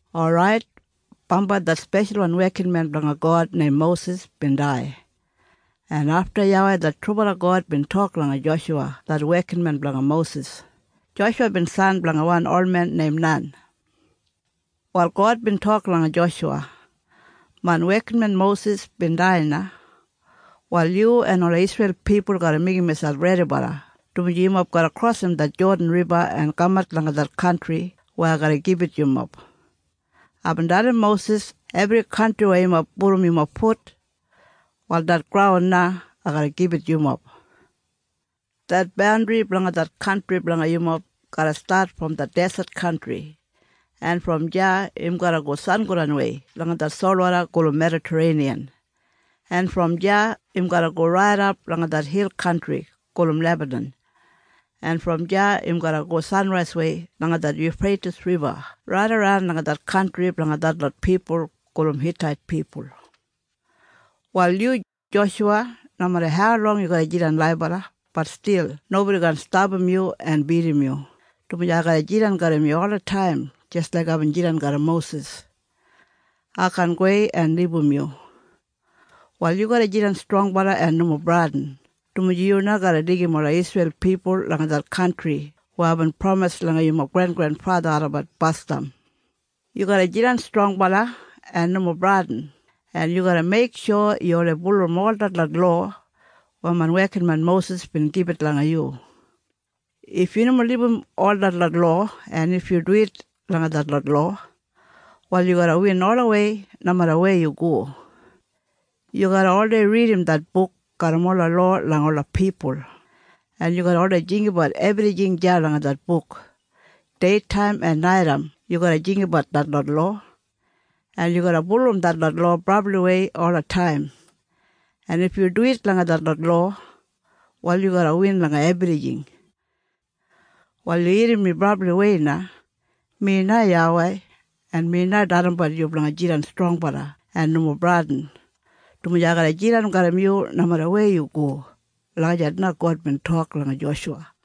Orait, bambai det speshalwan wekinmen blanga God neim Mosis bin dai, en afta YAWEI det trubala God bin tok langa Joshuwa det wekinmen blanga Mosis. Joshuwa bin san blanga wan olmen neim Nan. Wal God bin tok langa Joshuwa, “Main wekinmen Mosis bin dai na. Wal yu en ola Isreil pipul garra meigim miselp redibala, dumaji yumob garra krosim det Jodan Riba en kamat langa det kantri weya ai garra gibit yumob. Aibin dalim Mosis ebri kantri weya yumob pudum yumob fut, wal det graun na ai garra gibit yumob. Det bandri blanga det kantri blanga yumob garra stat brom det deset kantri, en brom deya im garra go sangodanwei langa det solwoda gulum Medatareiniyan, en brom deya im garra go raidap langa det hil kantri gulum Lebanan, en brom deya im garra go sanraiswei langa det Yufreitis Riba raidaran langa det kantri blanga detlot pipul gulum Hitait pipul. “Wal yu, Joshuwa, nomeda haulong yu garra jidan laibala, bat stil nobodi kaan stapam yu en bidim yu, dumaji ai garra jidan garram yu olataim jis laik aibin jidan garram Mosis. Ai kaan gowei en libum yu. Wal yu garra jidan strongbala en nomo bradin, dumaji yu na garra deigim ola Isreil pipul langa det kantri weya aibin pramis langa yumob grengrenfatha olabat basdam. Yu garra jidan strongbala en nomo bradin, en yu garra meiksho yu oldei bulurrum ol detlot lowa weya main wekinmen Mosis bin gibit langa yu. If yu nomo libum ol detlot lowa, en if yu duwit langa detlot lowa, wal yu garra win olawei nomeda weya yu go. Yu garra oldei ridim det buk garram ola lowa langa ola pipul, en yu garra oldei jinggabat ebrijing deya langa det buk. Deitaim en naitaim yu garra jinggabat detlot lowa, en yu garra bulurrum detlot lowa brabliwei olataim. En if yu duwit langa detlot lowa, wal yu garra win langa ebrijing. “Wal yu irrim mi brabliwei na. Mi na YAWEI, en mi na dalimbat yu blanga jidan strongbala en nomo bradin, dumaji ai garra jidan garram yu nomeda wujei yu go.” Lagijat na God bin tok langa Joshuwa.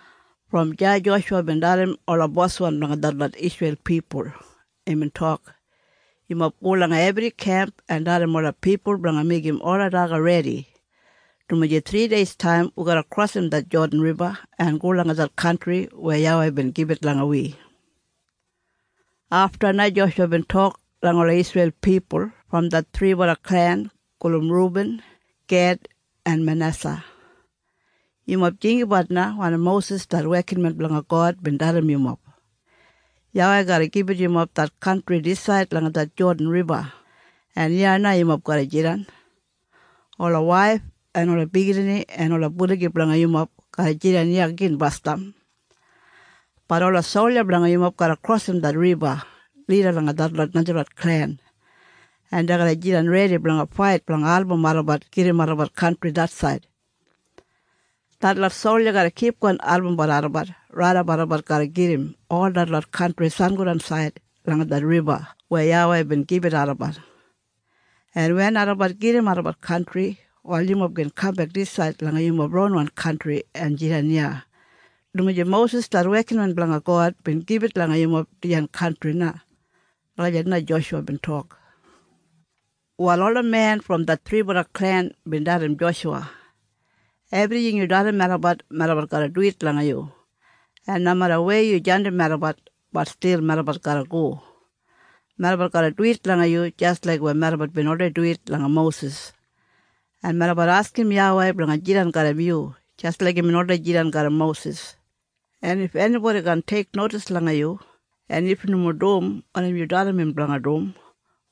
Brom deya Joshuwa bin dalim ola boswan blanga detlot Isreil pipul. Imbin tok, “Yumob go langa ebri kemp en dalim ola pipul blanga meigim ola daga redi, dumaji thrideistaim wi garra krosim det Jodan Riba en go langa det kantri weya YAWEI bin gibit langa wi.” Afta na Joshuwa bin tok langa ola Isreil pipul brom det thribala klen gulum Rubin, Ged en Manesa, “Yumob jinggabat na wanim Mosis det wekinmen blanga God bin dalim yumob, YAWEI garra gibit yumob det kantri disaid langa det Jodan Riba, en iya na yumob garra jidan. Ola waif en ola biginini en ola buligi blanga yumob garra jidan iya gin basdam. Bat ola solja blanga yumob garra krosim det riba lida langa detlot najalot klen, en dei garra jidan redi blanga fait blanga album olabat gedim olabat kantri det said. Detlot solja garra kipgon albumbat olabat raidap olabat garra gedim ol detlot kantri sangodansaid langa det riba weya YAWEI bin gibit olabat. En wen olabat gedim olabat kantri, wal yumob gin kambek disaid langa yumob ronwan kantri en jidan iya, dumaji Mosis det wekinmen blanga God bin gibit langa yumob dijan kantri na.” Lagijat na Joshuwa bin tok. Wal ola men brom det thribala klen bin dalim Joshuwa, “Ebrijing yu dalim melabat, melabat garra duwit langa yu, en nomeda weya yu jandim melabat, bat stil melabat garra go. Melabat garra duwit langa yu jis laik weya melabat bin oldei duwit langa Mosis. En melabat askim YAWEI blanga jidan garram yu jis laik imbin oldei jidan garram Mosis. En if enibodi kaan teiknodis langa yu, en if im nomo dum wanim yu dalim im blanga dum,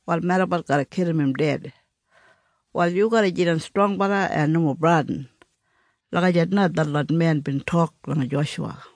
wal melabat garra kilim im ded. Wal yu garra jidan strongbala en nomo bradin.” Lagijat na detlot men bin tok langa Joshuwa.